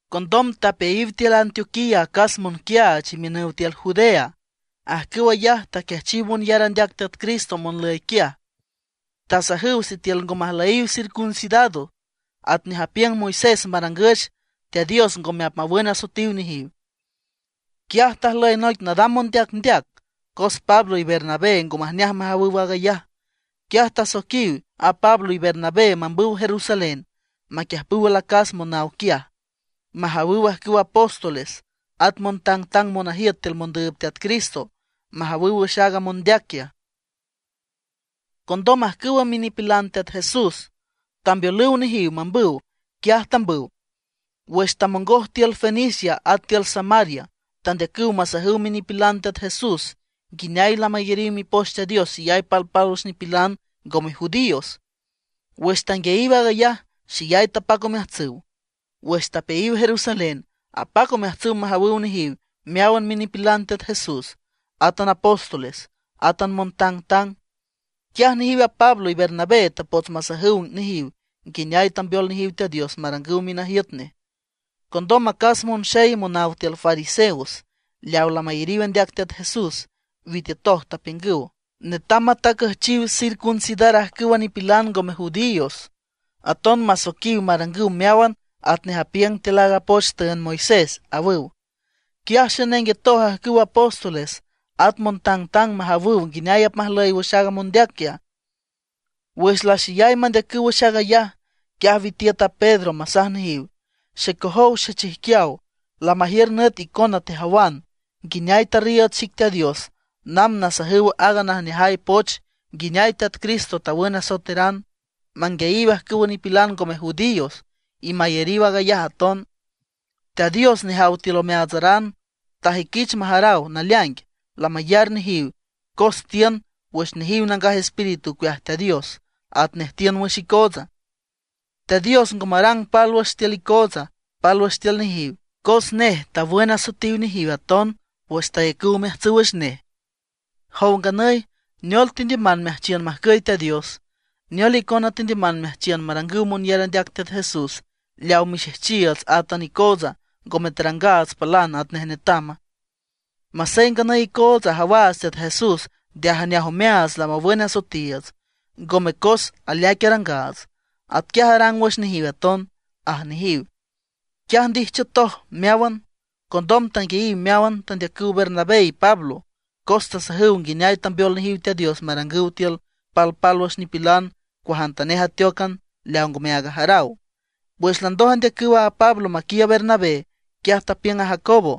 Condom tapeayiw tiül Antioquía acas monquiaach imiünüw tiül Judea. Ajcüw ayaj taquiajchiw monyar andeac Teat Cristo monlüy quiaj; tasajüw sitiül ngo majlüyiw circuncidado atnej apiüng Moisés marangüch, Teat Dios ngome apmawün asoetiw nejiw. Quiaj tajlüy noic nadam mondeacndeac, cos Pablo y Bernabé ngo majneaj majawüw aag ayaj. Quiaj tasoiquiw a Pablo y Bernabé mambüw Jerusalén maquiüjpüw alacas monaw quiaj, majawüw ajcüw apóstoles at montangtang monajiüt tiül mondüüb Teat Cristo, majawüw wüx aaga mondeac quiaj. Condom ajcüw minipilan Teat Jesús tambeolüw nejiw mambüw. Quiaj tambüw. Wüx tamongoj tiül Fenicia at tiül Samaria tandeacüw masajüw minipilan Teat Jesús nguineay lamayariw Mipoch Teat Dios xeyay palpálwüx nipilan ngome judíos. Wüx tanguiayiw aag ayaj, xeyay tapac omeajtsüw. Wüx tapeayiw Jerusalén, apac omeajtsüw majawüw nejiw meáwan minipilan Teat Jesús, átan apóstoles, átan montangtang. Quiaj nejiw a Pablo y Bernabé tapots masajüw nejiw nguineay tambeol nejiw Teat Dios marangüw minajiüt nej. Condom acas monxey monaw tiül fariseos, leaw lamayariw andeac Teat Jesús, witiütoj tapiüngüw: ―Netam matajcüchiw circuncidar ajcüwa nipilan ngome judíos, aton masoiquiw marangüw meáwan atnej apiüng tiül aaga poch tüünd Moisés ―awüw. Quiaj xenenguetoj ajcüw apóstoles at montangtang majawüw nguineay apmajlüy wüx aaga mondeac quiaj. Wüx laxeyay mandeacüw wüx aag ayaj, quiaj witiüt a Pedro masaj nejiw: ―Xecojow xechijquiaw, lamajiür nüt icona tejawan nguineay tarriiüd xic Teat Dios namb nasajüw aaga najneajay poch nguineay Teat Cristo awün asoeteran, manguiayiw ajcüwa nipilan ngome judíos y mayariw aag ayaj aton. Teat Dios nejaw tiül omeaatsaran, tajüiquich majaraw naleaing lamayar nejiw cos tiün wüx nejiw Nangaj Espíritu ocueaj Teat Dios atnej tiün wüx icoots. Teat Dios ngo marang pálwüx tiül icootsa, pálwüx tiül nejiw, cos nej tawün asoetiw nejiw aton, wüx tayacüw omeajtsüw wüx nej. Jow nganüy, ¿neol tendiüman meajchiün majcüy Teat Dios? ¿Neol icona tendiüman meajchiün marangüw monyar andeac Teat Jesús leaw mixejchiiüts átan icootsa ngome tarangaats palan atnej netama? Masey nganüy icootsa ajawaats Teat Jesús nde ajneaj omeaats lamawün asoetiiüts, ngome cos aleaic arangaats; atquiaj arang wüx nejiw aton ―aj nejiw. Quiaj ndijchiütoj meáwan, condom tanguiayiw meáwan tandeacüw Bernabé y Pablo cos tasajüw nguineay tambeol nejiw Teat Dios marangüw tiül palpálwüx nipilan cuajantanej ateócan leaw ngome aag ajaraw. Wüx landoj andeacüw a Pablo maquiiüb a Bernabé, quiaj tapiüng a Jacobo: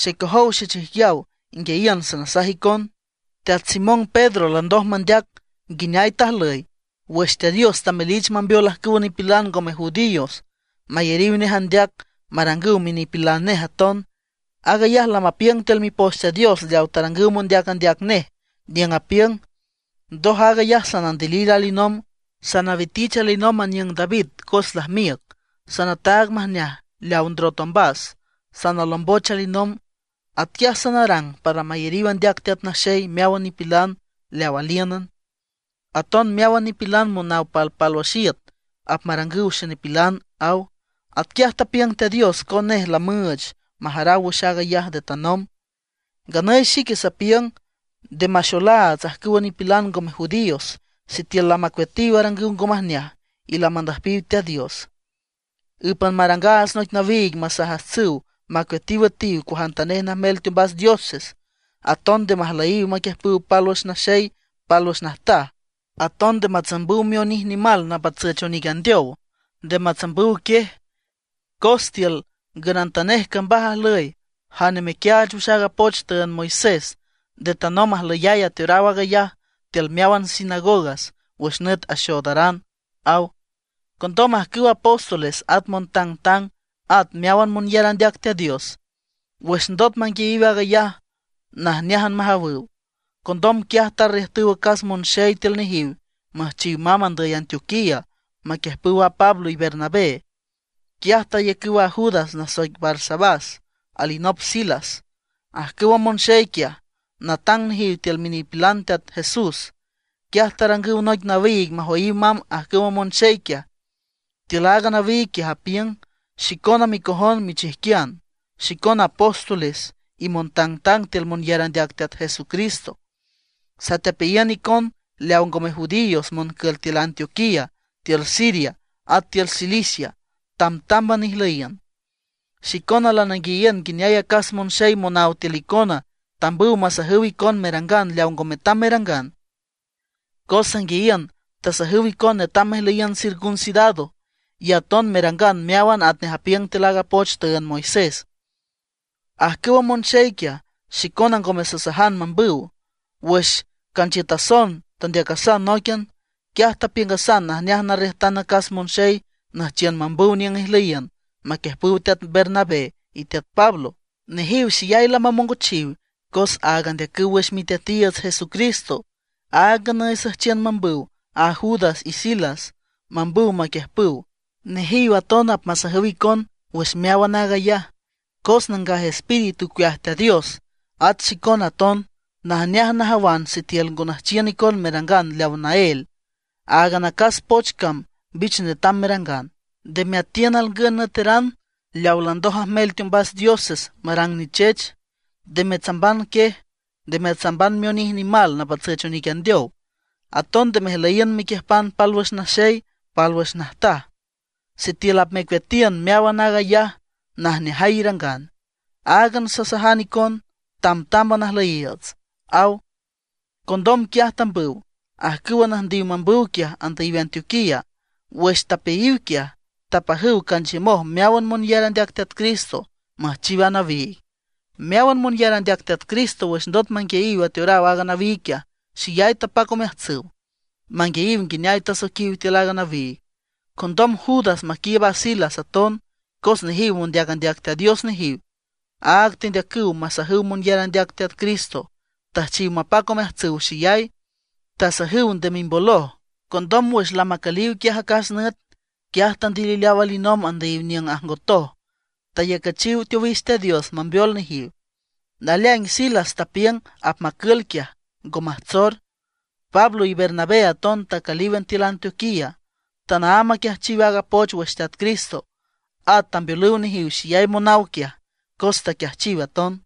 ―Xecojow xechijquiaw, inguiayiün sanasaj icon: Teat Simón Pedro landoj mandeac nguineay tajlüy wüx Teat Dios tamelich mambeol ajcüwa nipilan ngome judíos mayariw nej andeac marangüw minipilan nej aton. Aag ayaj lamapiüng tiül Mipoch Teat Dios leaw tarangüw mondeac andeac nej niüng apiüng: Ndoj aag ayaj sanandilil alinomb, sanawitich alinomb aniüng David cos lajmiüc; sanataag majneaj leaw ndrot ombas, sanalomboch alinomb. Atquiaj sanarang para mayariw andeac Teat Naxey meáwan nipilan leaw alíünan. Aton meáwan nipilan monaw palpálwüx iüt apmarangüw xenipilan, aw. Atquiaj tapiüng Teat Dios, cos nej lamüüch majaraw wüx aag ayaj nde tanomb. ’Nganüy xique sapiüng nde maxolaats ajcüwa nipilan ngome judíos sitiül lamacueatiw arangüw ngo majneaj y lamandüjpiw Teat Dios. Ǘpan marangaats noic nawiig masajajtsüw macueatiw üetiw cuajantanej najmel teombas dioses, aton nde majlüyiw maquiüjpüw pálwüx naxey pálwüx najtaj, aton nde matsambüw mionij nimal napatsüch onic andeow, nde matsambüw quiej. Cos tiül ngünantanej cambaj ajlüy jane mequiaach wüx aaga poch tüünd Moisés. Nde tanomb ajlüyay ateoraw aag ayaj tiül meáwan sinagogas wüx nüt axoodaran ―aw. Condom ajcüwa apóstoles at montangtang at meáwan monyar andeac Teat Dios, wüx ndot manguiayiw aag ayaj, najneájan majawüw. Condom quiaj tarriüjtüw acas monxey tiül nejiw müjchiw mamb andüy Antioquía maquiüjpüw a Pablo y Bernabé. Quiaj tayacüw a Judas nasoic Barsabás, alinop Silas. Ajcüwa monxey quiaj, natang nejiw tiül minipilan Teat Jesús. Quiaj tarangüw noic nawiig majoyiw mamb ajcüwa monxey quiaj. Tiül aaga nawiig quiaj apiüng: “Xicona micojon michijquian, xicona apóstoles y montangtang tiül monyar andeac Teat Jesucristo, satepeayiün icon leaw ngome judíos moncül tiül Antioquía, tiül Siria, at tiül Cilicia. Tambtámban ijlüyiün. Xicona lananguiayiün nguineay acas monxey monáwan tiül xicona tambüw masajüw icon merangan leaw ngo metam merangan. Cos sanguiayiün tasajüw icon netam mejlüyiün circuncidado, y aton merangan meáwan atnej apiüng tiül aaga poch tüünd Moisés. Ajcüwa monxey quiaj, xicona ngome sasajan mambüw. Wüx canchiütason tandeacasan nóiquian, quiaj tapiüngasan najneaj narriüjtan acas monxey nüjchiün mambüw niüng ijlüyiün maquiüjpüw teat Bernabé y teat Pablo. Nejiw xeyay lamamongochiw cos aag andeacüw wüx Miteatiiüts Jesucristo. Aag nganüy süjchiün mambüw a Judas y Silas mambüw maquiüjpüw. Nejiw aton apmasajüw icon wüx meáwan aag ayaj. Cos Nangaj Espíritu ocueaj Teat Dios, átan xicona aton, najneaj najawan sitiül ngo nüjchiün icon merangan leaw naél. Áagan acas poch cam mbich netam merangan: Nde meatiün alngün nüeteran leawa landoj ajmel teombas dioses marang nichech. Nde metsamban quiej, nde metsamban mionij nimal napatsüch onic andeow, aton nde mejlüyiün mequiüjpan pálwüx naxey pálwüx najtaj. Sitiül apmecueatiün meáwan aag ayaj, najneajay irangan. Áagan sasajan icon, tamtámban ajlüyiiüts”, aw. Condom quiaj tambüw, ajcüwa nüjndiw mambüw quiaj andüyiw Antioquía. Wüx tapeayiw quiaj, tapajüw canchiümoj meáwan monyar andeac Teat Cristo müjchiw a nawiig. Meáwan monyar andeac Teat Cristo wüx ndot manguiayiw ateoraw aaga nawiig quiaj, xeyay tapac omeajtsüw manguiayiw nguineay tasoiquiw tiül a nawiig. Condom Judas maquiiüb a Silas aton, cos nejiw mondeac andeac Teat Dios nejiw áag tendeacüw masajüw monyar andeac Teat Cristo, tüjchiw mapac omeajtsüw xeyay, tasajüw nde mimboloj. Condom wüx lamacüliw quiaj acas nüt, quiaj tandilileaw alinomb andüyiw niüng ajngotoj, tayacüchiw teowix Teat Dios mambeol nejiw. Naleaing Silas tapiüng apmacül quiaj, ngo majtsor. Pablo y Bernabé aton tacülíwan tiül Antioquía. Tanaámb aquiajchiw aaga poch wüx Teat Cristo. At tambeolüw nejiw xeyay monaw quiaj, cos taquiajchiw aton.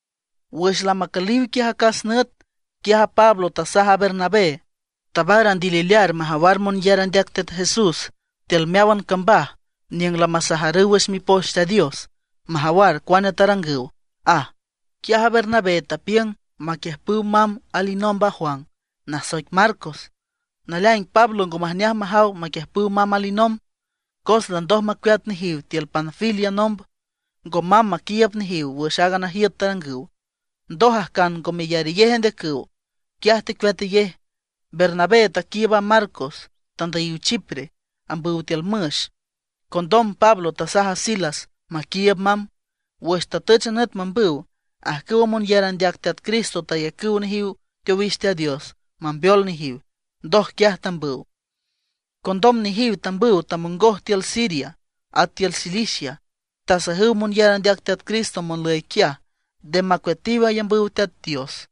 Wüx lamacüliw quiaj acas nüt, quiaj a Pablo tasaj a Bernabé: ―Tabar andililear majawar monyar andeac Teat Jesús tiül meáwan cambaj niüng lamasajarüw wüx Mipoch Teat Dios, majawar cuane tarangüw ―aj. Quiaj a Bernabé tapiüng maquiüjpüw mamb alinomb a Juan, nasoic Marcos. Naleaing Pablo ngo majneaj majaw maquiüjpüw mamb alinomb, cos landoj macueat nejiw tiül Panfilia nomb, ngo mamb maquiiüb nejiw wüx aaga najiüt tarangüw. Ndoj ajcan ngo meyarayej andeacüw, quiaj tecueatayej. Bernabé taquiiüb a Marcos, tandüyiw Chipre ambüw tiül müx. Condom Pablo tasaj a Silas maquiiüb mamb. Wüx tatüch a nüt mambüw, ajcüwa monyar andeac Teat Cristo tayacüw nejiw teowix Teat Dios mambeol nejiw. Ndoj quiaj tambüw. Condom nejiw tambüw tamongoj tiül Siria at tiül Cilicia, tasajüw monyar andeac Teat Cristo monlüy quiaj, nde macueatiw ayambüw Teat Dios.